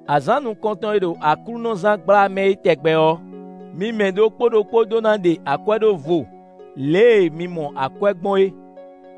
Azǎn nukɔntɔn e ɖo aklúnɔzán gbla mɛ é tɛgbɛ ɔ́, mi mɛ ɖokpó ɖokpó ɖó ná ɖe akwɛ́ ɖó vo lě e mi mɔ akwɛ́ gbɔn é,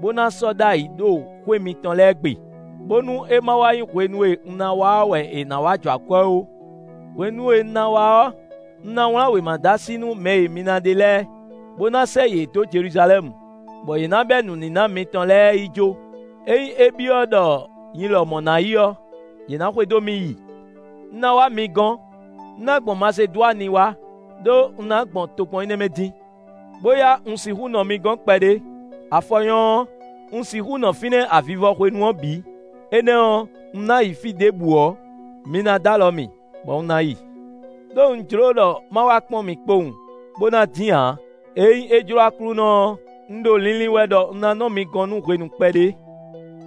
bó ná sɔ́ ɖ'ayǐ ɖo xwé mitɔn lɛ́ɛ gbe, bónú é ma wá nyí hwenu e un ná wá ɔ́ wɛ è nǎ wá jɔ akwɛ́ ó. Hwenu e un ná wá ɔ́, un ná wlán wěma dó así nú mɛ e mi ná ɖe lɛ́ɛ, bó ná sɛ́ yě dó Jeluzalɛ́mu, bɔ yě ná bɛ́ nǔníná mitɔn lɛ́ɛ yi jó. Ényí é byɔ́ ɖɔ nyi lɔmɔ̌ ná yi ɔ́, yě ná xwedó mì yi. Un ná wá mi gɔ́n; un ná gbɔn Masedwani wá; ɖó un ná gbɔn tokpɔn énɛ́ mɛ dín. Bóyá un sixú nɔ mi gɔ́n kpɛɖé; afɔ nyɔ́ ɔ́, un sixú nɔ fínɛ́ avivɔ hwenu ɔ́ bǐ; énɛ́ ɔ́, un ná yi fí ɖěbǔ ɔ́, mi ná dó alɔ mì bɔ un ná yi. Đó un jló ɖɔ ma wá kpɔ́n mi kpowun, bó ná dín ǎ. Ényí é jló Aklúnɔ ɔ́, un ɖo linlin wɛ ɖɔ un ná nɔ mi gɔ́n nú hwenu kpɛɖé.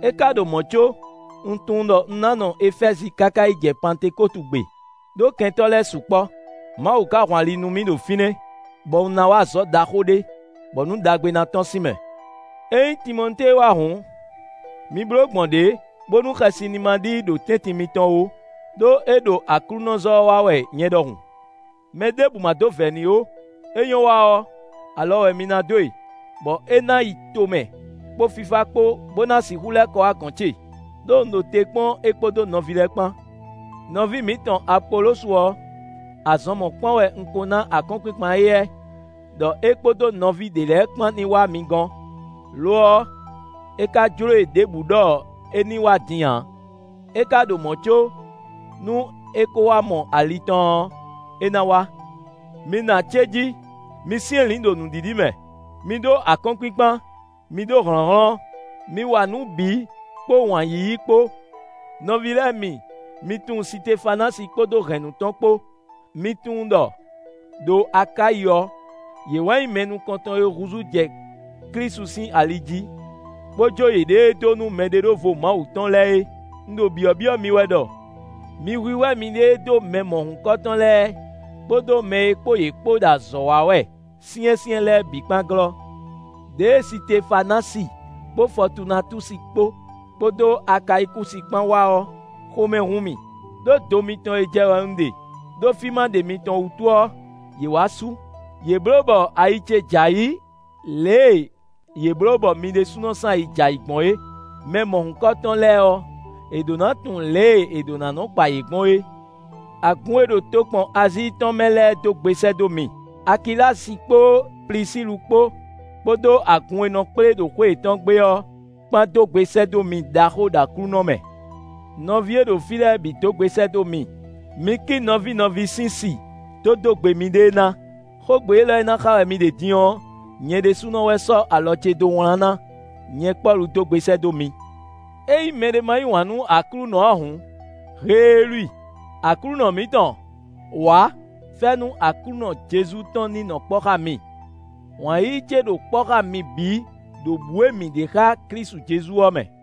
É ka ɖo mɔ̌ có, un tunwun ɖɔ un ná nɔ Efɛ́zi káká yi jɛ Pantekótu gbe. Đó kɛntɔ́ lɛ́ɛ sukpɔ́; Mawu ka hun ali nú mì ɖo fínɛ́, bɔ un ná wa azɔ̌ ɖaxó ɖé, bɔ nǔ ɖagbe ná tɔ́n sín mɛ. Ényí Timɔtée wá hǔn, mi bló gbɔn ɖě bónú xɛsi ní ma ɖi i ɖo tɛ́ntin mitɔn ó; ɖó é ɖo aklúnɔzɔ́ ɔ́ wa wɛ nyɛ ɖɔhun. Mɛ ɖěbǔ má dó vɛ̌ n'i ó; é nyɔ́ wa ɔ́, alɔ wɛ mi ná dó e, bɔ é ná yi tomɛ kpó fífá kpó bó ná sixú lɛ́ kɔ wá gɔ̌n ce, ɖó un ɖo te kpɔ́n é kpódó nɔví lɛ́ɛ kpán. Nɔví mǐtɔn Apolosu ɔ́, azɔn mɔ̌kpán wɛ un ko ná akɔ́nkpinkpan éyɛ́ ɖɔ é kpódó nɔví ɖě lɛ́ɛ kpán ní wá mi gɔ́n; lo ɔ́, é ka jló e ɖěbǔ ɖɔ é ní wá din ǎ; é ka ɖo mɔ̌ có, nú é ko wá mɔ ali tɔn ɔ́, é ná wá. Mi nɔ acéjí; mi syɛ́nlǐn ɖo nǔɖiɖi mɛ; mi ɖó akɔ́nkpinkpan; mi ɖó hlɔ̌nhlɔ́n. Mi wa nǔ bǐ kpó wǎn yíyí kpó. Nɔví lɛ́ɛ mi, mi tunwun Sitefanási kpódó hɛ̌nnu tɔn kpó: mi tunwun ɖɔ, ɖo Akáyi ɔ́, yě wɛ nyí mɛ nukɔntɔn e húzú jɛ Klísu sín ali jí, bó jó yěɖée dó nú mɛɖeɖóvo Mawu tɔn lɛ́ɛ é. Un ɖo byɔ̌byɔ́ mi wɛ ɖɔ, mi hwíhwɛ́ miɖée dó mɛ mɔ̌hunkɔtɔn lɛ́ɛ, kpódó mɛ e kpó yě kpó ɖo azɔ̌ wa wɛ syɛ́nsyɛ́n lɛ́ɛ bǐ kpán glɔ́. Đěe Sitefanási kpó Fɔtunatúsi kpó, kpódó Akayikúsi kpán wá ɔ́, xomɛ hun mì, ɖó do mitɔn e jɛ wɛ un ɖe, ɖó fí ma ɖe mitɔn wútu ɔ́, yě wá sú; yě blǒ bɔ ayi ce j'ayǐ lě e yě blǒ bɔ mi ɖésúnɔ sín ayi j'ayǐ gbɔn é. Mɛ mɔ̌hunkɔtɔn lɛ́ɛ ɔ́, è ɖǒ ná tunwun lě e è ɖǒ ná nɔ́ kpa yě gbɔn é. Agun e ɖo tokpɔn Azíi tɔn mɛ lɛ́ɛ dó gbe sɛ́ dó mi. Akilási kpó Plisílu kpó, kpódó agun e nɔ kplé ɖo xwé yětɔn gbe ɔ́ kpán dó gbe sɛ́ dó mi ɖaxó ɖo Aklúnɔ mɛ. Nɔví e ɖo fí lɛ́ɛ bǐ dó gbe sɛ́ dó mi. Mi kí nɔví nɔví sín si dó dó gbe miɖée ná. Xógbe élɔ́ e ná xa wɛ mi ɖe din ɔ́, nyɛ ɖésúnɔ wɛ sɔ́ alɔ ce dó wlán ná: Nyɛ Pɔ́lu dó gbe sɛ́ dó mi. Ényí mɛɖé ma yí wǎn nú Aklúnɔ ǎ hǔn, heelú i! Aklúnɔ mǐtɔn, wǎ! Fɛ́nú Aklúnɔ Jezu tɔn ní nɔ kpɔ́ xá mi. Wǎn yíyí ce ɖo kpɔ́ xá mi bǐ ɖo bǔ e mǐ ɖe xá Klísu Jezu ɔ́ mɛ.